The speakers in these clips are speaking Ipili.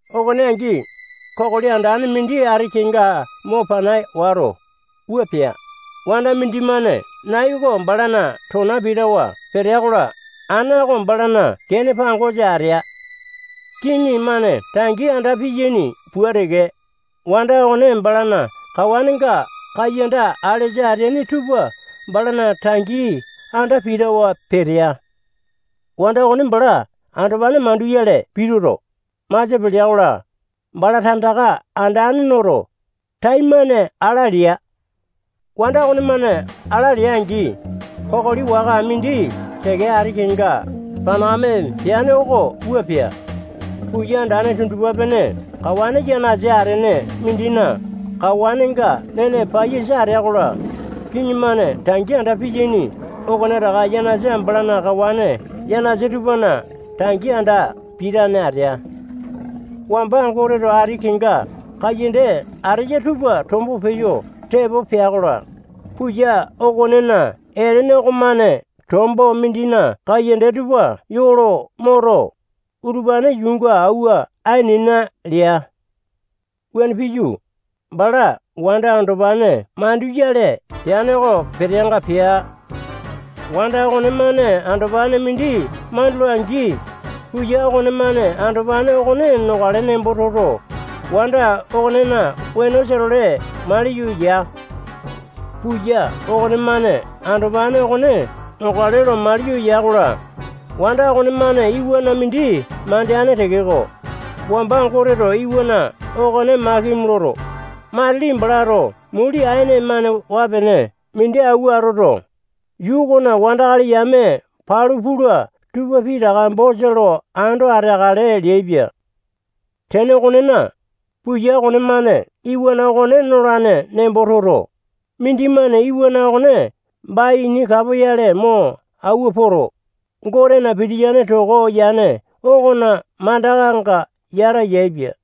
Okone angi, kokoli andane mindi ati kenga mo pana wato, wua pea: Wanda mindimane nai oko balana tona pitawa petea-kola, ana oko balana kene pangosa atea. Kiŋi-mane tangi anda piyaini pua teke, wanda okone balana kawanenga kaiyanda alesa ateaini tupa balana tangi anda pitawa petea. Wanda okone bala andopane manduyale pituto, masia pelea-kola, bala tandaka andane noto, taimane ala lea. Wanda okonemane ala lea-angi, kokoli waka mindi teke ati kenga panakame peane oko wua pea: Puya andane tundupa-pene kawane yanasa atene mindina kawanenga nene paiyasa atea-kola, kiŋi-mane tangi anda piyaini okonetaka yanasa balana kawane yanasa tupana tangi anda pitane atea. Wamba Goteto ati kenga kaiyanda ateya tupa tombo peyo tepo pea-kola, puya okonena etene okomane tombo mindina kaiyanda tupa yoo lo moto, utupane yuunga auwa ainena lea. Wuane piyu, bala wanda andopane manduyale peane oko peteanga pea. Wanda okonemane andopane mindi mandula-angi, puya okonemane andopane okone nokale nembo toto, wanda okonena wenosa-tole maliyo ya. Puya okonemane andopane okone nokale lo maliyo ya-kola, wanda okonemane iwana mindi mandeane tekeko, wamba Goteto iwana okone makimi loto, matili balato muli aene-mane waa-pene mindi auwa atoto, yuu okona wandakali yame palu pula tupa pitaka bosa lo ando ateakale leaipia. Tene okonena, puya okonemane iwana okone nolane nembo toto, mindimane iwana okone baini kapoyale mo auwa poto, Gotena pitiyane toko yane okona mandakanga yata yaepia.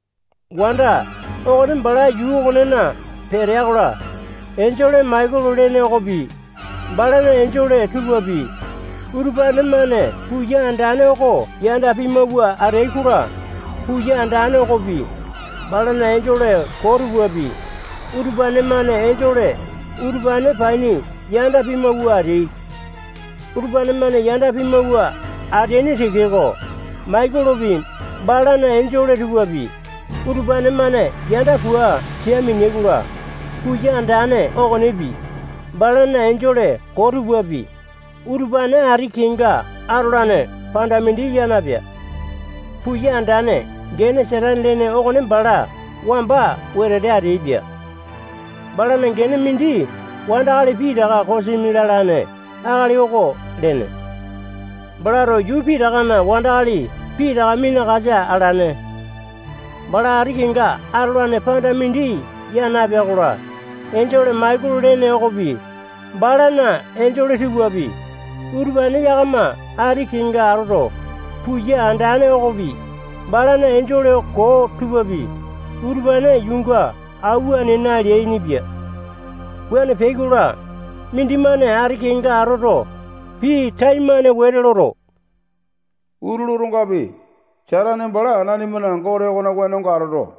Wanda okone bala yuu okonena petea-kola, enjole Maikolo lene okopi, balana enjole tupapi, utupane-mane puya andane oko yanda pimawua ateai-kola, puya andane okopi, balana enjole koo tupapi, utupane-mane enjole utupane paini yanda pimawua ateai. Utupane-mane yanda pimawua ateaini tekeko, Maikolopi, balana enjole tupapi, utupane-mane yanda pua sia mineai-kola, puya andane okonepi, balana enjole koo tupapi, utupane ati kenga atolane panda mindi ya napea. Puya andane gene Satane lene okone bala wamba wetete ateaipia. Balana gene mindi wandakali pitaka kosimi lalane akali oko lene. Balato yuu pitakana wandakali pitaka minakasa alane. Bala ati kenga atolane panda mindi ya napea-kola, enjole Maikolo lene okopi, balana enjole tupapi, utupane yakama ati kenga atoto, puya andane okopi, balana enjole koo tupapi, utupane yuunga auwa ainena leainipia. Wuane peai-kola, mindimane ati kenga atoto, pii taimane wete loto, utulu otongapi, Satane bala nanimana Gote okona wenonga atoto,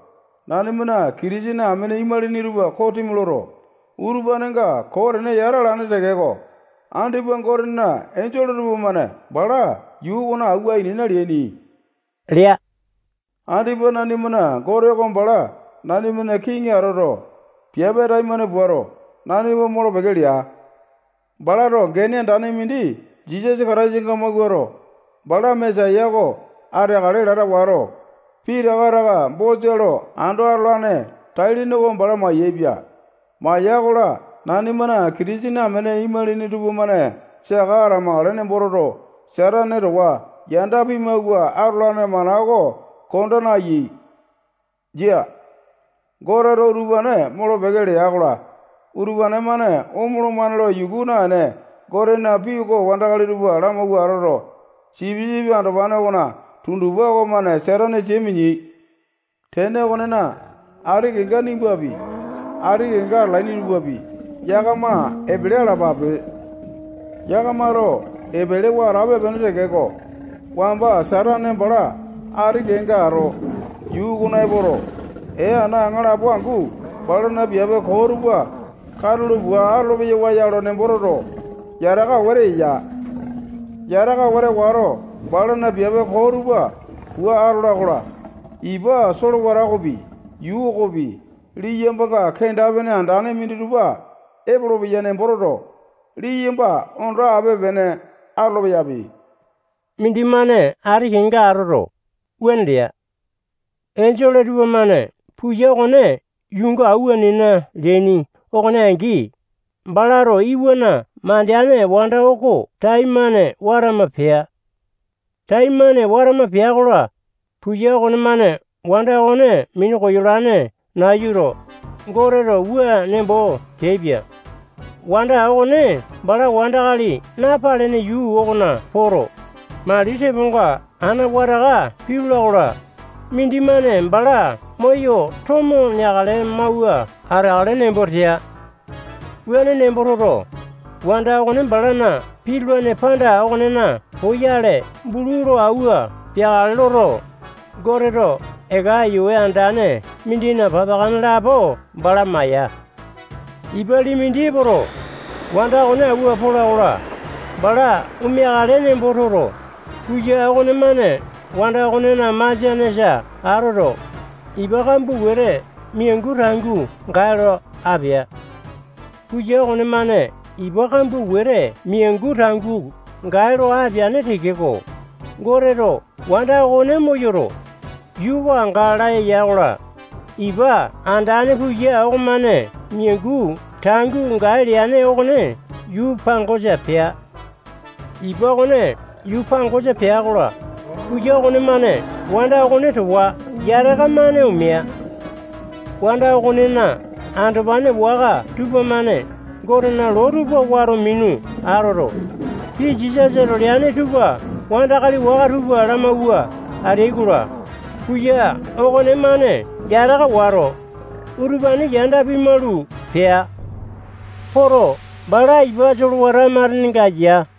nanimana Kitisene amene imalini tupa kosimi loto, utupanenga koo tene yata alane tekeko, andipa Gotena enjole tupamane bala yuu okona auwa ainena leaini lea. Andipa nanimana Gote oko bala nanimana kiŋi atoto, piape taimane puato, nanima molo-peke lea. Balato gene andane mindi Jisasa Kataisanga mawuato, bala Mesaya oko ateakale lata wato, pitaka taka bosa lo ando atolane tai-lene oko bala maiyepia. Maya-kola, nanimana Kitisene amene imalini tupamane saka atamakale nembo toto, Satane towa yanda pimawua atolane mana oko konda nayai. Jia. Goteto utupane molo-peke lea-kola, utupane-mane omolomane lo yuku naene, Gotena pii oko wandakali tupa lamauwa atoto, sipisipi andopane okona tundupa okomane Satane sia mineai. Tene okonena, ati kenga nimbapi, ati kenga atalaini tupapi, yakama epele alapape. Yakamato epelewa atape-pene tekeko, wamba Satane bala ati kenga ato, yuu okona epoto, ee ana aŋalapo angu balana piape koo tupa katulo pua atolo-peyawa ya lo nembo toto, yataka wete eya. Yataka wete wato, balana piape koo tupa pua atola-kola, ipa solewata okopi, yuu okopi, liyambanga kenda-pene andane minditupa epolopeya nembo toto, liyamba ondo ape-pene atolo-peyapi. Mindimane ati kenga atoto, wuane lea. Enjole tupamane puya okone yuunga auwa ainena leaini okone angi, balato iwana mandeane wanda oko taimane watama pea. Taimane watama pea-kola, puya okonemane wanda okone minu koyolane nayuto, Goteto wua nembo teaipia: Wanda okone bala wandakali napalene yuu okona poto, mali teponga ana wataka pitula-kola, mindimane bala moyo tomo neakale mauwa ateakale nembo tea. Wuane nembo toto, wanda okone balana pitulane panda okonena poyale bulu lo auwa peakale loto, Goteto eka aiyawe andane mindina papakane lapo bala maya. Ipa lii mindi epoto, wanda okone auwa pola-kola, bala omeakale nembo toto, puya okonemane wanda okonena masianesa atoto, ipa kambua wete miangu tangua gae lo apea. Puya okonemane ipa kambua wete miangu tangua gae lo apeane tekeko, Goteto wanda okone moyoto, yuu oko anga laya ya-kola, ipa andane puya okonemane miangu tangua gae leane okone yuu pangosa pea. Ipa okone yuu pangosa pea-kola, puya okonemane wanda okone towa yataka-mane omea. Wanda okonena andopane waka tupamane Gotena loo tupa wato minu atoto, pii Jisasato leane tupa wandakali waka tupa lamauwa ateai-kola, puya okonemane yataka wato, utupane yanda pimalu pea. Poto, bala ipa solewata matenenga ya.